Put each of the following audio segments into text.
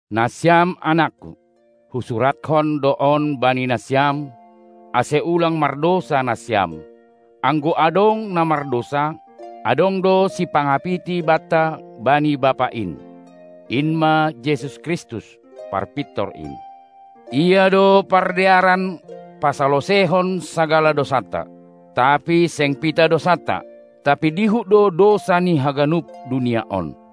Nasiam anakku, husurathon do on bani nasiam, ase ulang mardousa nasiam. Anggo adong na mardousa, adong do sipangapiti banta bani Bapa in, in ma Jesus Kristus, Parpintor in. Ia do pardearan pasaloseihon sagala dousanta, tapi seng pitah dousanta, tapi dihut do dousa ni haganup dunia on.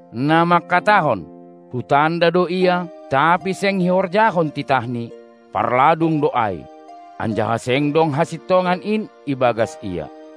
Na manghatahon: Hutanda do Ia, tapi seng ihorjahon titahNi, parladung do ai, anjaha seng dong hasintongan in ibagas ia.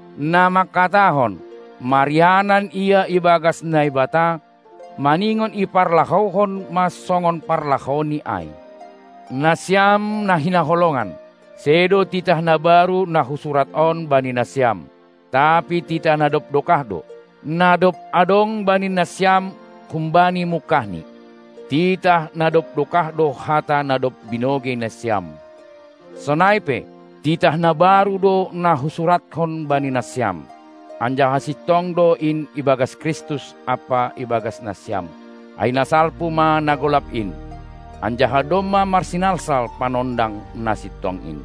Na mangkatahon, marianan ia ibagas Naibata, maningon iparlahouhon ma songon parlahouNi ai. Nasiam na hinaholongan, sedo titah na baru na husurat on bani nasiam, tapi titah na dob dokah do, na dob adong bani nasiam humbani mungkahni. Titah na dob dokah do hata na dob binogei nasiam. Sonai pe, titah na baru do na husurathon bani nasiam, anjaha sintong do in ibagas Kristus ampa ibagas nasiam, ai na salpu ma na golap in, anjaha domma marsinalsal Panondang na Sintong in.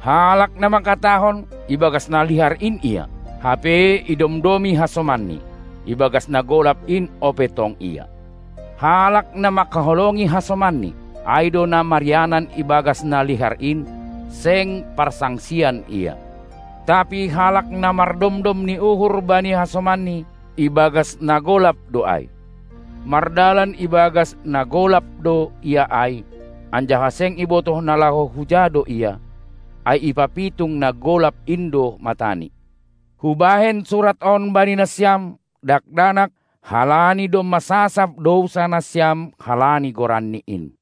Halak na manghatahon, ibagas na lihar in ia, hape idomdomi hasomanni, ibagas na golap in ope tong ia. Halak, na mangkaholongi hasomanni, ai do na marianan ibagas na lihar in, seng parsangsian ia. Tapi halak na mardomdom ni uhur bani hasomanni, ibagas na golap do ai; mardalan ibagas na golap do ia ai, anjaha seng ibotoh na laho huja do ia, ai ipapitung na golap in do matani. Hubahen surat on bani nasiam, dakdanak, halani domma sasap dousa nasiam halani goranNi in.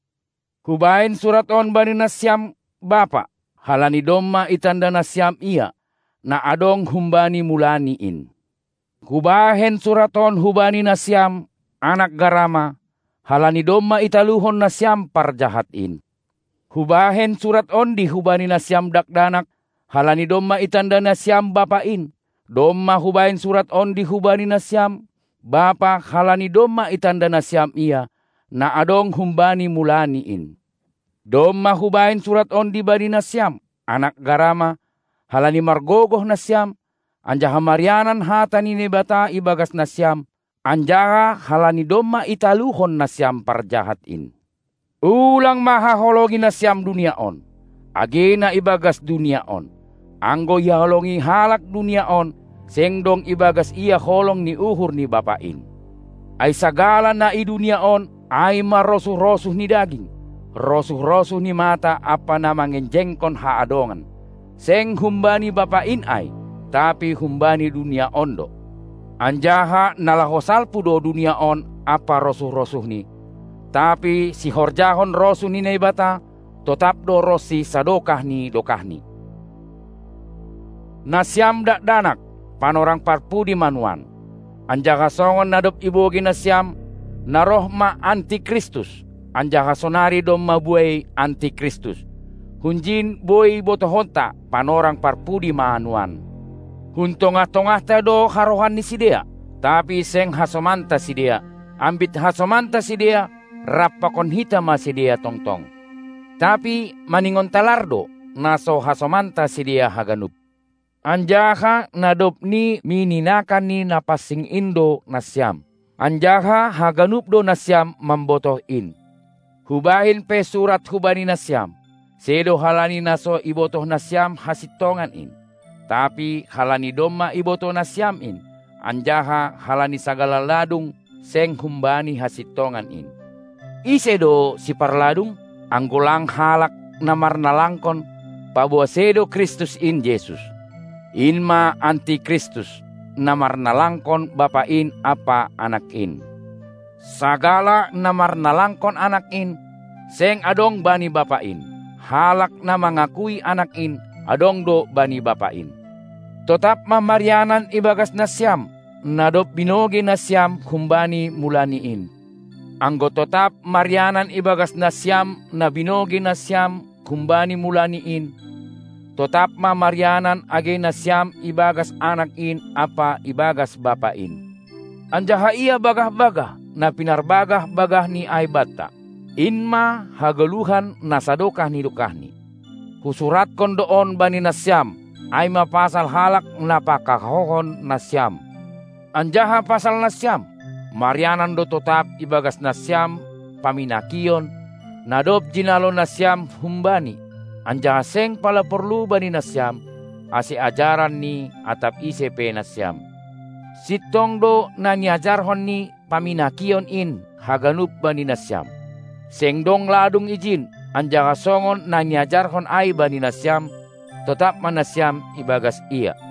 Hubahen surat on bani nasiam, bapa, halani domma itanda nasiam Ia, na adong humbani mulani in. Hubahen surat on hubani nasiam, anak garama, halani domma italuhon nasiam parjahat in. Hubahen surat ondi hubani nasiam dakdanak, halani domma itanda nasiam Bapa in. Domma hubahen surat ondi hubani nasiam, bapa, halani domma itanda nasiam Ia, na adong humbani mulani in. Domma hubahen surat ondi bani nasiam, anak garama, halani margogoh nasiam, anjaha marianan hata ni Naibata ibagas nasiam, anjaha halani domma italuhon nasiam parjahat in. Ulang ma haholongi nasiam dunia on, age na ibagas dunia on. Anggo ihaholongi halak dunia on, seng dong ibagas ia holong ni uhur ni Bapa in. Ai sagala na i dunia on, ai ma rosuh-rosuh ni daging, rosuh-rosuh ni mata ampa na mangenjengkon haadongan, seng humbani Bapa in ai, tapi humbani dunia on do. Anjaha na laho salpu do dunia on ampa rosuh-rosuhni, tapi sihorjahon rosuh ni Naibata, totap do ronsi sadokah ni dokahni. Nasiam dakdanak, panorang parpudi ma nuan; anjaha songon na dob ibogei nasiam, na roh ma Anti Kristus, anjaha sonari domma buei Anti Kristus; hunjin boi botohonta panorang parpudi ma nuan. Hun tongah-tongahta do harohan ni sidea, tapi seng hasomanta sidea; ambit hasomanta sidea, rap pakon hita ma sidea tongtong. Tapi maningon talar do, na so hasomanta sidea haganup. Anjaha na dob ni mininakan ni Napansing in do nasiam, anjaha haganup do nasiam mambotoh in. Hubahen pe surat hubani nasiam, sedo halani na so ibotoh nasiam hasintongan in, tapi halani domma ibotoh nasiam in, anjaha halani sagala ladung seng humbani hasintongan in. Ise do siparladung, anggo lang halak na marnalangkon, paboa sedo Kristus in Jesus? In ma Anti Kristus, na marnalangkon Bapa in ampa Anak in. Sagala na marnalangkon Anak in, seng adong bani Bapa in, halak na mangakui Anak in, adong do bani Bapa in. Totap ma marianan ibagas nasiam, na dob binogei nasiam humbani mulani in. Anggo totap marianan ibagas nasiam na binogei nasiam humbani mulani in, totap ma marianan age nasiam ibagas Anak in ampa ibagas Bapa in. Anjaha ia bagah-bagah, na pinarbagah-bagahNi ai banta, in ma hagoluhan na sadokah ni dokahni. Husurathon do on bani nasiam, ai ma pasal halak na pakahouhon nasiam. Anjaha pasal nasiam, marianan do totap ibagas nasiam pamminakion, na dob jinalo nasiam hum-Bani. Anjaha seng pala porlu bani nasiam, ase ajaran ni atap ise pe nasiam. Sintong do na niajarhon ni pamminakion in haganup bani nasiam, seng dong ladung ijin, anjaha songon na niajarhon ai bani nasiam, totap ma nasiam ibagas Ia.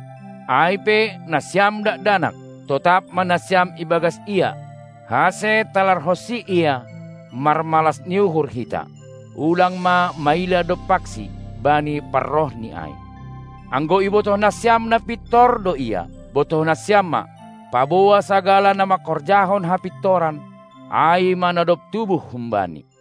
Ai pe, nasiam dakdanak, totap ma nasiam ibagas Ia, ase talarhonsi Ia marmalas ni uhur hita, ulang ma maila dompakSi bani parrohNi ai. Anggo ibotoh nasiam na pintor do Ia, botoh nasiam ma, paboa sagala na manghorjahon hapintoran, ai ma na dob tubuh hum-Bani.